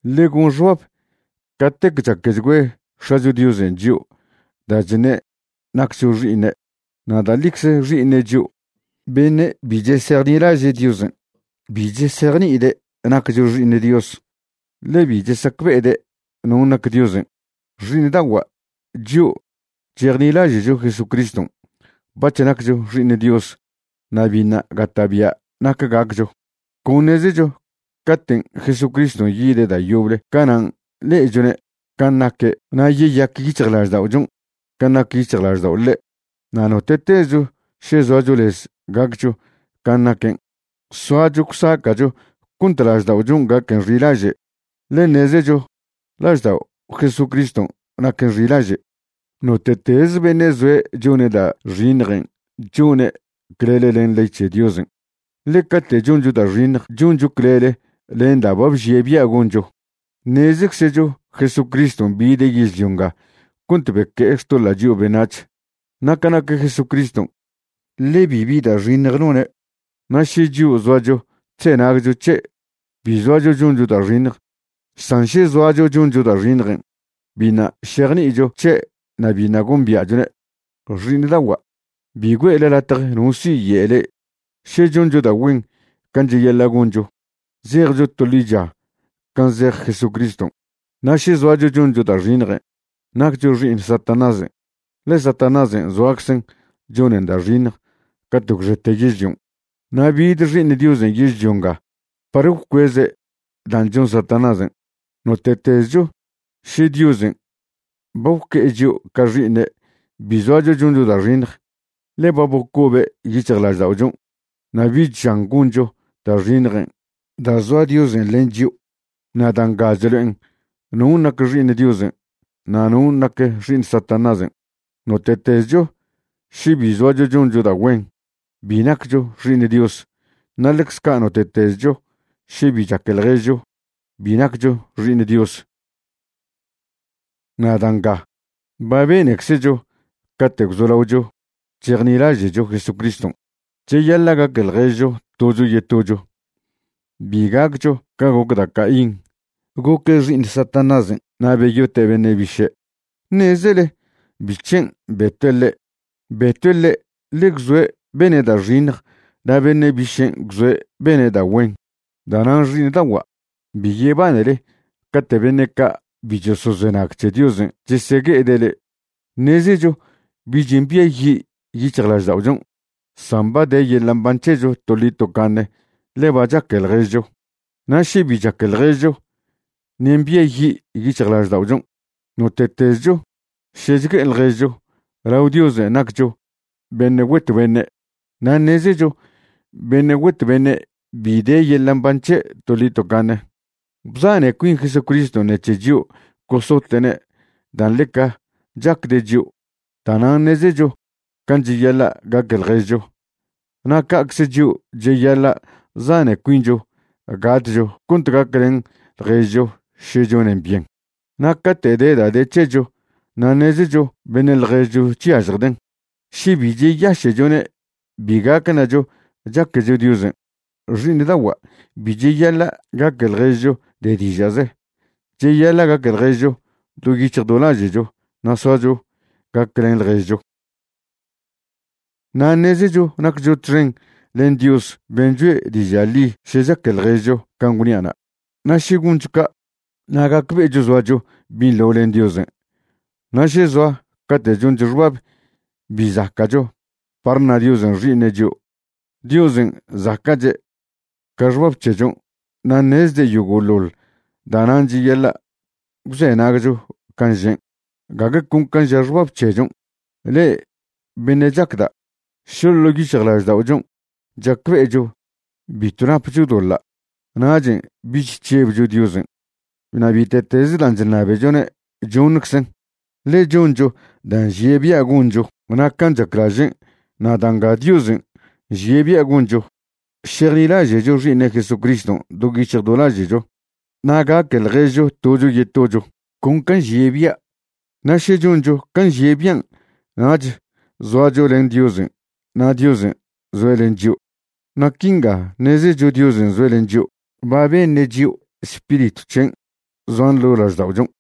Ḻe gon xbab catec chaquechgüe X̱acho Diosen' chio' da' chne' naccho xi'iṉe', na' da' ḻicze xi'iṉe' chio'. Beṉe' bi chesejnilaže' Diosen' bi chesejni'ide' naccho xi'iṉ Dios, ḻe bi chesacbe'ede' non' nac Diosen'. Xi'iṉda'ogua', chio' chejnilaže'cho Jesucriston' bac̱h naccho xi'iṉ Dios. Na' biṉa' gata'bia' nac gaccho. Con ṉezecho caten' Jesucriston' yide' da' yoble canan' le'echwne' can' naque' na' yeyac yic̱hjlažda'ochon' can' nac yic̱hjlaždao' le'. Na' note'tezcho še zoacho lez gaccho can' naquen', soacho gwsaca'cho cont lažda'ochon' gaquen xilaže', ḻe ṉezecho laždao' Jesucriston' naquen xilaže'. Note'tez beṉe' zoe' chone' da' xiṉjen' chone' clele len ley c̱he Diosen', ḻe cate' choncho da' xiṉj choncho clele len da' ba bžie' bia' goncho. Ṉezczecho Jesucriston' bide' yežlio nga cont beque'e xtoḻa' chio' beṉac̱h, na' ca nac Jesucriston', ḻe bibi da' xiṉj none'. Na' še chio' zoacho chzenagcho c̱he', bi zoacho choncho da' xiṉj, san še zoacho choncho da' xiṉjen', biṉa' šejni'icho c̱he' na' biṉa' gombia'chone'. Xi'iṉda'ogua', bi güe'le latje no siye' le'e, še choncho da' güen can' cheyaḻa' goncho, zejcho to ḻicha can' zej Jesucriston'. Na' še zoacho choncho da' xiṉj, naccho xi'iṉ Satanásen', ḻe Satanásen' zoaczen chonen da' xiṉj cate' gwxete yežlion'. Na' bid Xi'iṉ Diosen' yežlio nga par gwcueze' dan' chon Satanásen'. Note'tezcho še Diosen' ba gwque'e chio' ca xi'ine' bi zoacho choncho da' xiṉj, ḻe ba bocobe' yic̱hjlažda'ochon' na' bich žan goncho da' xiṉjen' da' zoa Diosen' len chio'. Na' da' nga chlo'en non' nac xi'iṉ Diosen' na' non' nac xi'iṉ Satanásen': note'tezcho še bi zoacho choncho da' güen, bi naccho xi'iṉ Dios, na' ḻecz ca' note'tezcho še bi chaque ḻježcho, bi naccho xi'iṉ Dios. Na' da' nga ba beneczecho cate' gwzolaocho chejnilaže'cho Jesucriston': cheyaḻa' gaque ḻježcho tocho yetocho. Bi gaccho ca goc da' Caín, goque' xi'iṉ Satanásen' na' beyote' beṉe' biše'. ¿Ṉezele bic̱hen' betue' ḻe'? Betue' ḻe' ḻe gwzoe' bene' da' xiṉj na' beṉe' bišen' gwzoe' bene' da' güen. Da'nan' xi'iṉda'ogua', bi yebanele cate' beṉe' ca' bi chosozenag c̱he Diosen' chesegue'ede' le'e. Ṉezecho bich mbiayi' yic̱hjlažda'ochon', san ba de yeḻa' mban c̱hecho toḻi tocaṉe ḻe ba chaque ḻježcho. Na' še bi chaque ḻježcho, ṉe' mbiayi' yic̱hjlažda'ochon'. Note'tezcho še chgue'e ḻježcho, lao Diosen' naccho beṉe' güet beṉe'. Na' ṉezecho beṉe' güet beṉe' bi de yeḻa' mban c̱he' toḻi tocaṉe. Bzane cuin Jesucriston' ṉec̱he chio' gosote'ne' dan' ḻeca chacde' chio', da'nan' ṉezecho can' cheyaḻa' gaque ḻježcho. Na' ca'cze chio' cheyaḻa' zane cuincho gatcho cont gaclen ḻježcho še chonen byen. Na' cate' de da' de c̱hecho na' ṉezecho beṉe' ḻježcho chyažjden', še bi cheyaše'chone' bi gac ṉacho chaquecho Diosen'. Xi'iṉda'ogua', bi cheyaḻa' gaque ḻježcho de diža'ze. Cheyaḻa' gaque ḻježcho do yic̱hj do laže'cho na' soacho gaclen ḻježcho. Na' ṉezecho naccho txen len Dios ben' choe' diža' ḻi še chaque ḻježcho can' gwnia'na', na' še goncho ca', na' gacbe'echo zoacho binḻo len Diosen'. Na' še zoa cate' choncho xbab bi zaca'cho par ṉa Diosen' xi'iṉe' chio', Diosen' zaca'che' ca xbab c̱hechon' na' ṉezde' yogo'ḻoḻ. Da'nan' cheyaḻa' gwzenagcho can' žen', gague con can' ža xbab c̱hechon'. Le'e beṉe' chacda', še ḻo' yic̱hjlažda'ochon' chacbe'echo bitw napcho doḻa', nachen' bich chžebcho Diosen'. Na' bite'tez dan' chṉabechone' choṉczen', ḻe choncho da' nžie' bia' goncho na' can' chaclažen'. Na' da' nga Diosen' nžie' bia' goncho, šejnilaže'cho Xi'iṉe' Jesucriston' do yic̱hj do laže'cho na' gaque ḻježcho tocho yetocho, con can' nžie' bia'. Na' še choncho can' nžie' bian', nach zoacho len Diosen' na' Diosen' zoe' len chio'. Na' quinga ṉezecho Diosen' zoe' len chio': ba beṉe' chio' Spiritw c̱hen' zoan ḻo' lažda'ochon.